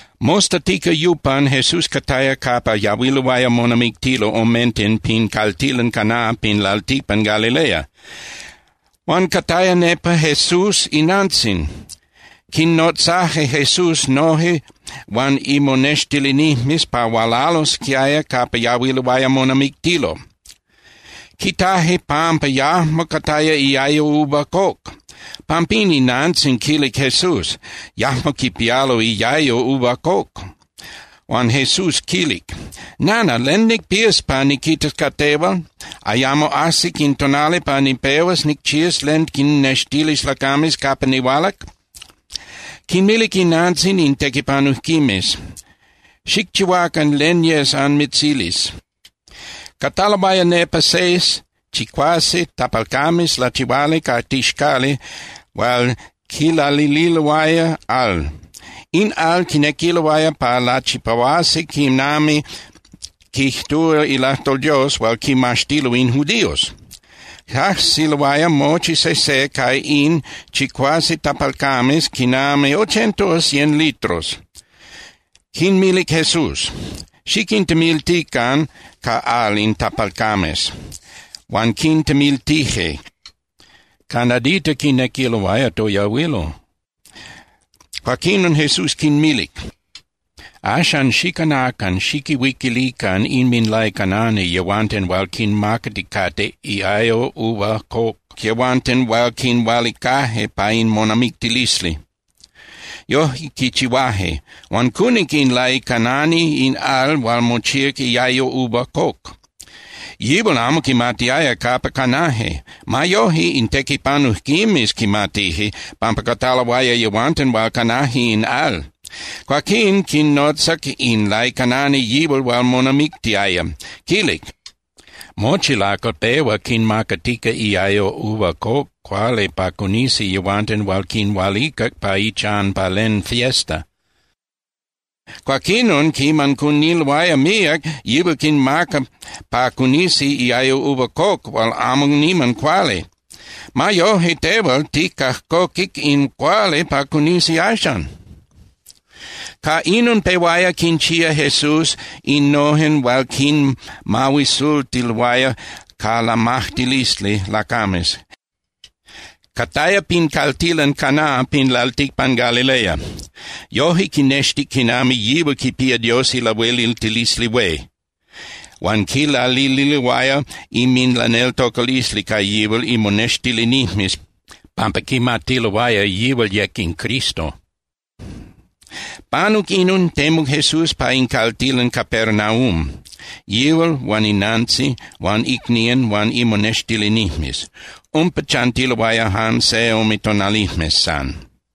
Mostatica yupan Jesús cataya capa yahuiloaya monamictilo omenten pin caltilan Caná pin lalticpan Galilea. Huan cataya nepa Jesús inantzin. Quinnotzaje Jesús noje huan imonextilinijmes pa hualalosquiaya capa yahuiloaya monamictilo. Quitaje pampa yajmo cataya iayo uva coc. Pampín inantzin quilic Jesús: —Yajmo quipialo iayo uva coc. Huan Jesús quilic: —Nana, ¿len nicpías pa niquitas ca tehual? Ayamo ajsic in tonali pa nipehuas nicchías len quinnextilis lacames capa nihualac. Quinmilic inantzin in tequipanujquimes: —Xicchihuacan len yes anmitzilis. Cataloaya nepa seis (chicuase) tapalcames lachihuali ca tixcali hual quilalililoaya al. In al quinequiloaya pa lachipahuasi quinami quijtúa ilajtol Dios hual quimaxtilo in judíos. Cajsiloaya mochi sejse ca in chicuase tapalcames quinami ochenta o cien litros. Quinmilic Jesús: —Xiquintemiltican ca al in tapalcames. Huan quintemiltije, ca nadita quinequiloaya toyahuilo. Cuaquinon Jesús quinmilic: —Axan, xicanacan, xiquihuiquilican inminlaicanani yehuanten hual quinmacaticate iayo uva coc yehuanten hual quinhualicaje pa in monamictilisli. Yojque quichihuaje. Huan cunic in laicanani in al hual mochíac iayo uva coc. Yihual amo quimatiaya capa canaje. Ma yoje, in tequipanujquimes quimatije, pampa cataloaya yehuanten hual canaje in al. Cuaquín quinotzac in laicanani yihual hual monamictiaya. Quilic: —Mochi lacal pehua quinmacatica iayo uva coc cuali pa cunisi yehuanten hual quinhualicac pa ichan pa len fiesta. Cuaquinon quiman cuniloaya míac, yihual quinmaca pa cunisi iayo uva coc hual amo niman cuali. Ma yoje, tehual ticajcoquic in cuali pa cunisi axan. Ca inon pehuaya quinchía Jesús innojen hual quinmahuisultiloaya ca lamajtilisli lacames. Cataya pin caltilan Caná pin lalticpan Galilea. Yoje quinextic quinami yihual quipía Dios ilahueliltilisli hué, huan quilalililoaya inminlaneltocalisli ca yihual imonextilinijmes pampa quimatiloaya yihual yec in Cristo. Panuc inon, temuc Jesús pa in caltilan Capernaum, yihual huan inantzin huan icnían huan imonextilinijmes. Umpa chantiloaya jan se ome tonalijmes san.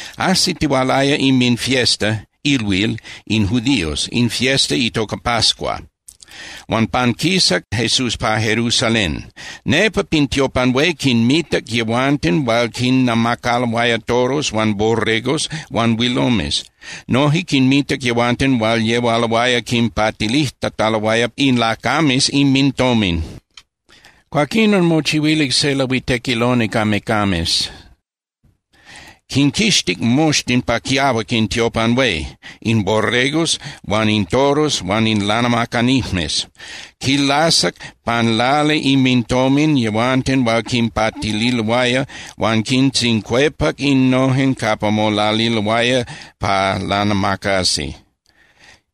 Ajsitihualaya inminfiesta (ilhuil) in judíos, in fiesta itoca pascua, huan panquisac Jesús pa Jerusalén. Nepa pin tiopan hué quinmitac yehuanten hual quinnamacaloaya toros huan borregos huan huilomes. Noje quinmitac yehuanten hual yehualoaya quinpatilijtataloaya in lacames inmintomin. Cuaquinon mochihuilic se lahuitequiloni ca mecames, quinquixtic moxtin pa quiahuac in tiopan hué, in borregos huan in toros huan in lanamacanijmes. Quilasac pan lali inmintomin yehuanten hual quinpatililoaya, huan quintzincuepac innojen capa molaliloaya pa lanamacasi.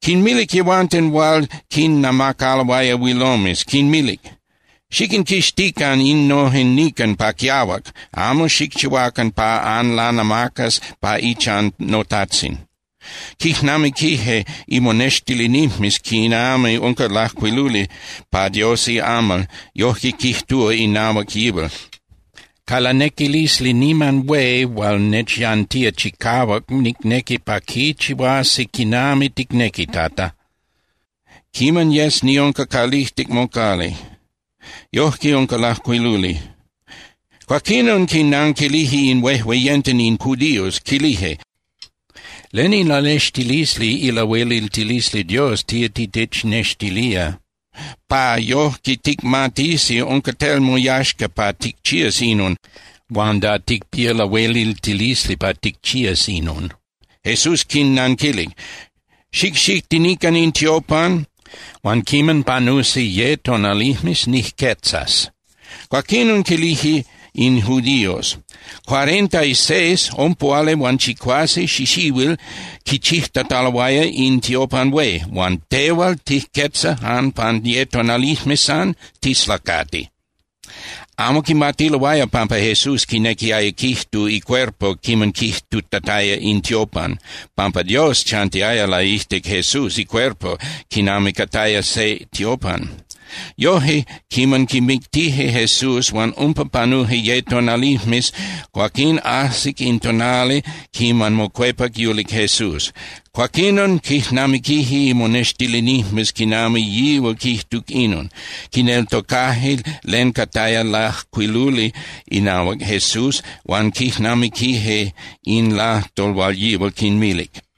Quinmilic yehuanten hual quinnamacaloaya huilomes, quinmilic: —¡Xiquinquixtican innojen nican pa quiahuac, amo xicchihuacan pa anlanamacas pa ichan noTajtzin! Quijnamiquije imonextilinijmes quinami unca lajcuiluli pa Dios iamal, yojque quijtúa inahuac yihual: “Ca lanequilisli niman hué hual nechyantía chicahuac nicnequi pa quichihuasi quinami ticnequi, Tata, quiman yes niunca calijtic mocali.” Yojque unca lajcuiluli. Cuaquinon quinanquilije in huejueyenten in judíos, quilije: —¿Len ilanextilisli ilahueliltilisli Dios tía titechnextilía, pa yojque ticmatisi unca tel moyaxca pa ticchías inon, huan da ticpía lahueliltilisli pa ticchías inon? Jesús quinnanquilic: —Xicxitinican in tiopan huan quiman panusi ye tonalijmes, nijquetzas. Cuaquinon quilije in judíos: —Cuarenta y seis (Ompuhualihuanchicuase) xixihuil quichijtataloaya in tiopan hué, huan ¿tehual tijquetzas jan pan ye tonalijmes san? Tislacati. Amo quimatiloaya pampa Jesús quinequiaya quijtu icuerpo quiman quijtutataya “in tiopan”, pampa Dios chantiaya laijtic Jesús icuerpo quinami cataya se tiopan. Yoje, quiman quimictije Jesús huan umpa panuje ye tonalijmes, cuaquín ajsic in tonali quiman mocuepac yulic Jesús. Cuaquinon quijnamiquije imonextilinijmes quinami yihual quijtuc inon. Quineltocaje len cataya lajcuiluli inahuac Jesús huan quijnamiquije in lajtol hual yihual quinmilic.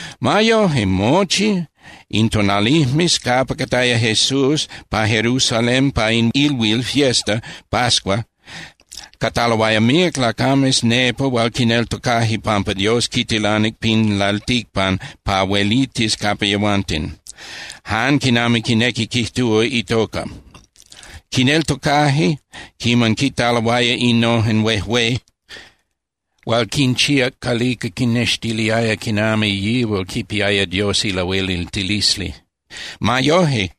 Ma yoje, mochi in tonalijmes capa cataya Jesús pa Jerusalén pa in ilhuil (fiesta) pascua, cataloaya míac lacames nepa hual quineltocaje pampa Dios quitilanic pin lalticpan pa huelitis capa yehuanten, jan quinami quinequi quijtúa itoca. Quineltocaje quiman quitaloaya innojen huejué hual quinchíac calica quinnextiliaya quinami yihual quipiaya Dios ilahueliltilisli. Ma yoje,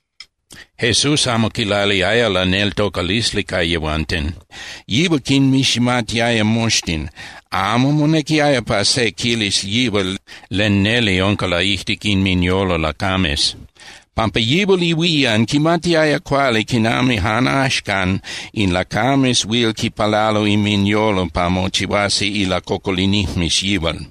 Jesús amo quilaliaya laneltocalisli ca yehuanten. Yihual quinmiximatiaya moxtin. Amo monequiaya pa se quilis yihual len neli unca laijtic inminyolo lacames, pampa yihual ihuían quimatiaya cuali quinami jan axcan in lacames huil quipalalo inminyolo pa mochihuasi ilacocolinijmes yihual.